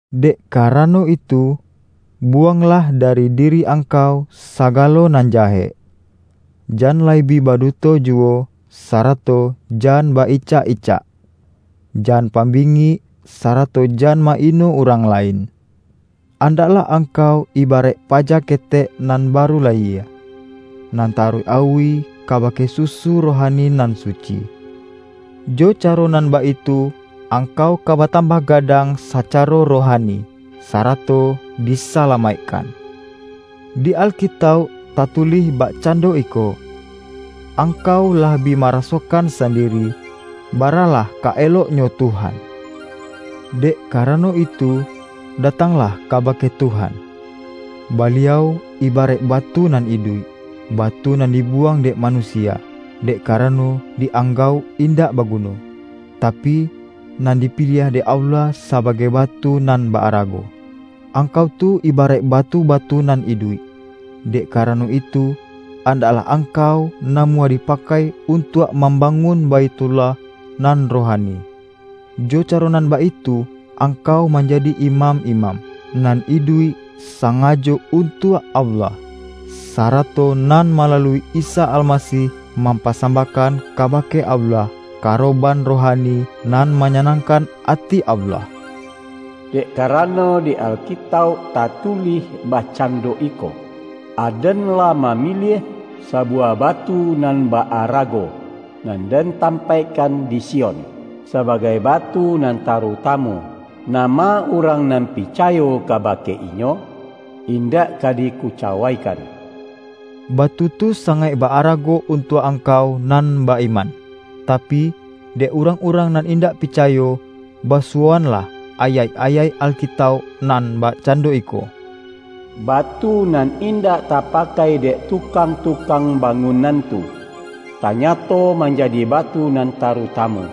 Dek karano itu, buwanglah da-ri diri angkau sagalo nan jahek; jan lai bi baduto juwo, sarato jan ba-icak-icak. Jan pambingik, sarato jan ma-ino urang lain. Andaklah ang-kau ibaraik paja ketek nan baru layie, nan taruih auih kabake susu roha-ni nan suci. Jo caro nan baitu angkau ka batambah gadang sacaro rohani, sarato disalamaikkan. Di Alkitauk tatulih bakcando iko,”Angkau lah bi marasokan sandiri, baralah ka elok-nyo Tuhan.” Dek karano itu, datanglah kabake Tuhan. Baliau ibaraik batu nan iduik, batu nan dibuwang dek manusia, dek karano di-anggauk indak baguno; ta-pi, nan dipiliah dek Allah sabagai ba-tu nan ba-arago. Angkau tu ibaraik batu-batu nan iduik. Dek karano itu, andaklah angkau namuah dipakai un-tuak mambangun Baithullah nan ro-hani. Jo caro nan baitu angkau man-jadi imam-imam, nan iduik sangajo untuak Allah, sarato nan malalui Isa Almasih mampasambahkan kabake Allah, karoban rohani nan manya-nangkan ati Allah. ”Dek karano, di Alkitauk tatulih bakcando iko, Aden lah mamiliah sabuwah batu nan ba-arago, nan Den tampaikkan di Sion sabagai batu nan tarutamu; nama urang nan picayo kabake Inyo, indak ka dikucawaikan.” Batu tu sangaik ba-arago untuak angkau nan ba-iman. Tapi, dek urang-urang nan indak picayo, basuwoanlah ayaik-ayaik Alkitauk nan bakcando iko,”Batu nan indak tapakai dek tukang-tukang bangunan tu, tanyato manjadi batu nan tarutamu,”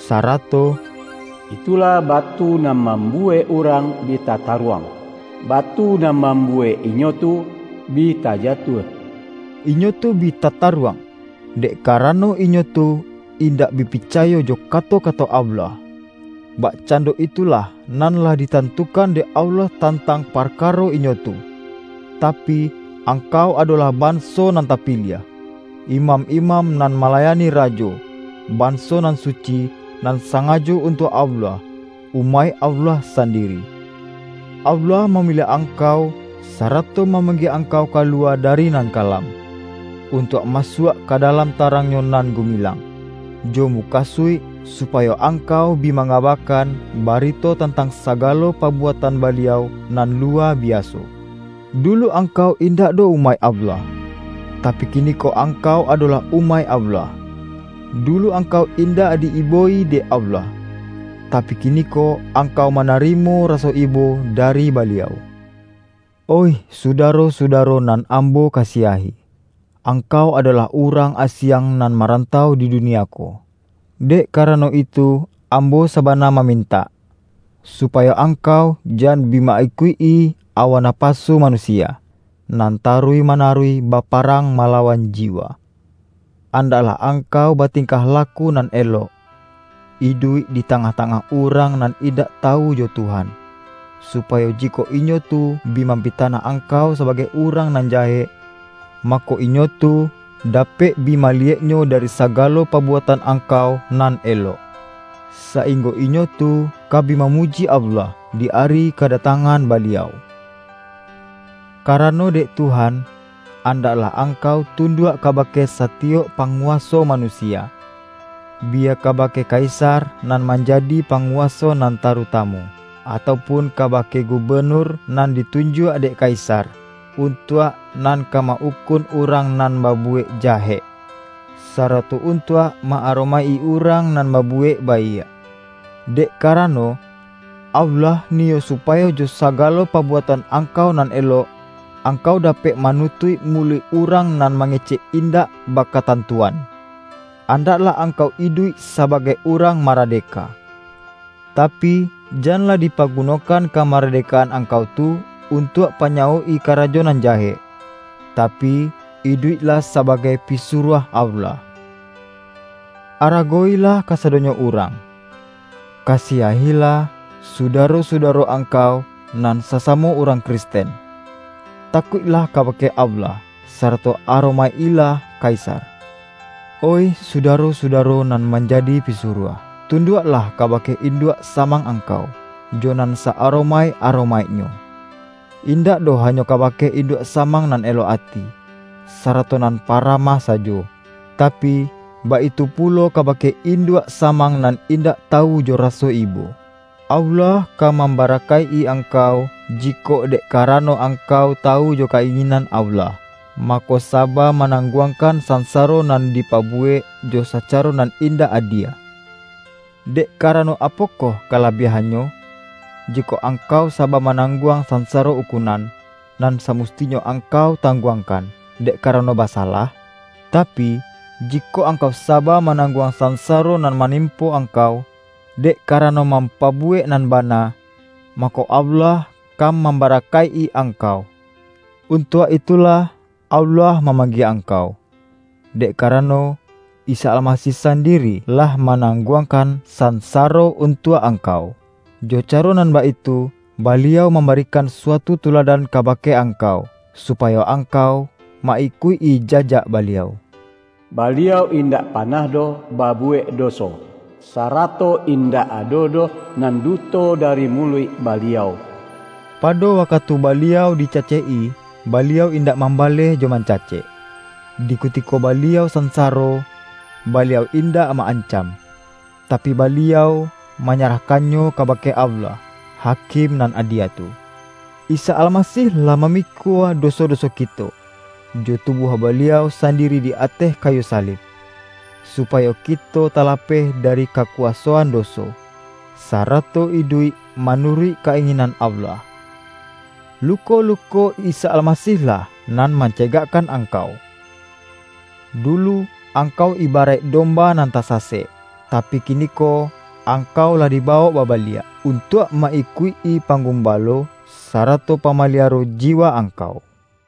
sarato,”Itulah batu nan mambuwek urang bi tataruang, batu nan mambuwek inyo tu bi tajatuah.” Inyo tu bi tataruang, dek karano inyo tu indak bi picayo jo kato-kato Allah. Bakcando itulah nan lah ditantukan dek Allah tantang parkaro inyo tu. Tapi, angkau adolah banso nan ta-piliah, imam-imam nan malayani Ra-jo, banso nan suci, nan sangajo un-tuak Allah, umaik Allah sandiri. Allah mamiliah angkau, sarato mamanggie angkau kaluwa dari nan kalam, un-tuak masuak ka dalam tarang-Nyo nan gumilang, jo mukasuik, supayo angkau bi mangabakan, barito tan-tang sagalo pabuatan Baliau nan lu-wa biaso. Dulu angkau indak doh umaik Allah, tapi, kiniko angkau ado-lah umaik Allah. Dulu angkau indak di-ibo-i dek Allah, tapi, kiniko angkau manarimo raso ibo dari Baliau. Oih sudaro-sudaro nan ambo ka-siahi! Angkau adolah urang asiang, nan marantau di dunia ko. Dek kara-no itu ambo sabana mamintak, supa-yo angkau jan bi ma-ikuik-i awa na-pasu manusia, nan taruih manaruih baparang malawan jiwa. Andak-lah angkau batingkah laku nan elok, iduik di tangah-tangah urang nan in-dak tawu jo Tuhan, supayo jikok inyo tu bi mampitanah angkau sabagai urang nan jahek, mako, inyo tu da-pek bi maliyeknyo dari sagalo pabu-atan angkau nan elok, sainggo inyo tu ka bi mamuji Allah, di ari kadatang-an Baliau. Karano dek Tuhan, andaklah ang-kau tunduak kabake satiyok pangu-waso manusia: biya kabake kaisar nan manjadi panguwaso nan taruta-mu, atau pun kabake gubenur nan ditunjuak dek kaisar, untuak nan ka ma-ukun urang nan babuwek jahek, sarato untuak ma-aromaik-i urang nan babuwek baiak. Dek karano, Allah niyo supayo jo sagalo pabuatan ang-kau nan elok, angkau dapek manu-tuik muluik urang nan mangecek in-dak bakatantuan. Andaklah angkau iduik sabagai urang maradeka, tapi, janlah dipagunokan kamaradekaan angkau tu, untuak panyawok-i karajo nan jahek, tapi, iduiklah sabagai pi-suruah Allah. Aragowilah kasado-nyo urang, kasiahilah sudaro-sudaro angkau nan sasamo urang Kristen. Takuiklah kabake Allah, sarato aro-maik-ilah kaisar. Oih sudaro-sudaro nan manjadi pisuruah, tunduaklah kabake induak samang angkau, jo nan sa-aromaik-aromaiknyo; indak doh hanyo kaba-ke induak samang nan elok ati, sara-to nan paramah sajo, tapi, baitu pulo kabake induak samang nan indak ta-wu jo raso ibo. Allah ka mambara-kaik-i angkau, jikok dek karano ang-kau tawu jo ka-inginan Allah, mako, saba manangguangkan sansaro nan dipabuwek jo sacaro nan indak adie. Dek karano, apokoh kalabiahan-nyo, jikok angkau saba manangguang sansaro ukunan, nan samustinyo ang-kau tangguangkan, dek karano basa-lah? Tapi, jikok angkau saba, manang-guang sansaro nan manimpo angkau, dek karano mampabuwek nan bana, mako, Allah ka mambarakaik-i ang-kau. Untuak itulah Allah mamang-gie angkau. Dek karano, Isa Almasih sandiri lah manangguangkan sansa-ro untuak angkau, jo caro nan baitu, Baliau mambarikan suatu tuladan kabake angkau, supayo angkau ma-ikuik-i jajak Baliau. Baliau indak panah doh babuwek doso, sarato in-dak ado doh nan duto dari muluik Ba-liau. Pado wakatu Baliau dicacek-i, Baliau indak mambaleh jo mancacek. Di kutiko Baliau sansaro, Baliau in-dak ma-ancam; tapi, Baliau manya-rahkannyo kabake Allah, Hakim nan adie tu. Isa Almasih lah mamikua doso-doso kito, jo tubuah Baliau san- diri di ateh kayu salib, supayo kito ta-lapeh dari kakuwasoan doso, sarato iduik manuruik ka-inginan Allah. Lu-ko-luko Isa Almasih-lah nan mance-gakkan angkau. Dulu angkau iba-raik domba nan tasasek, tapi, kiniko angkau lah dibawok babaliak, untuak ma-ikuik-i Panggubalo, sarato Pama-liaro jiwa angkau.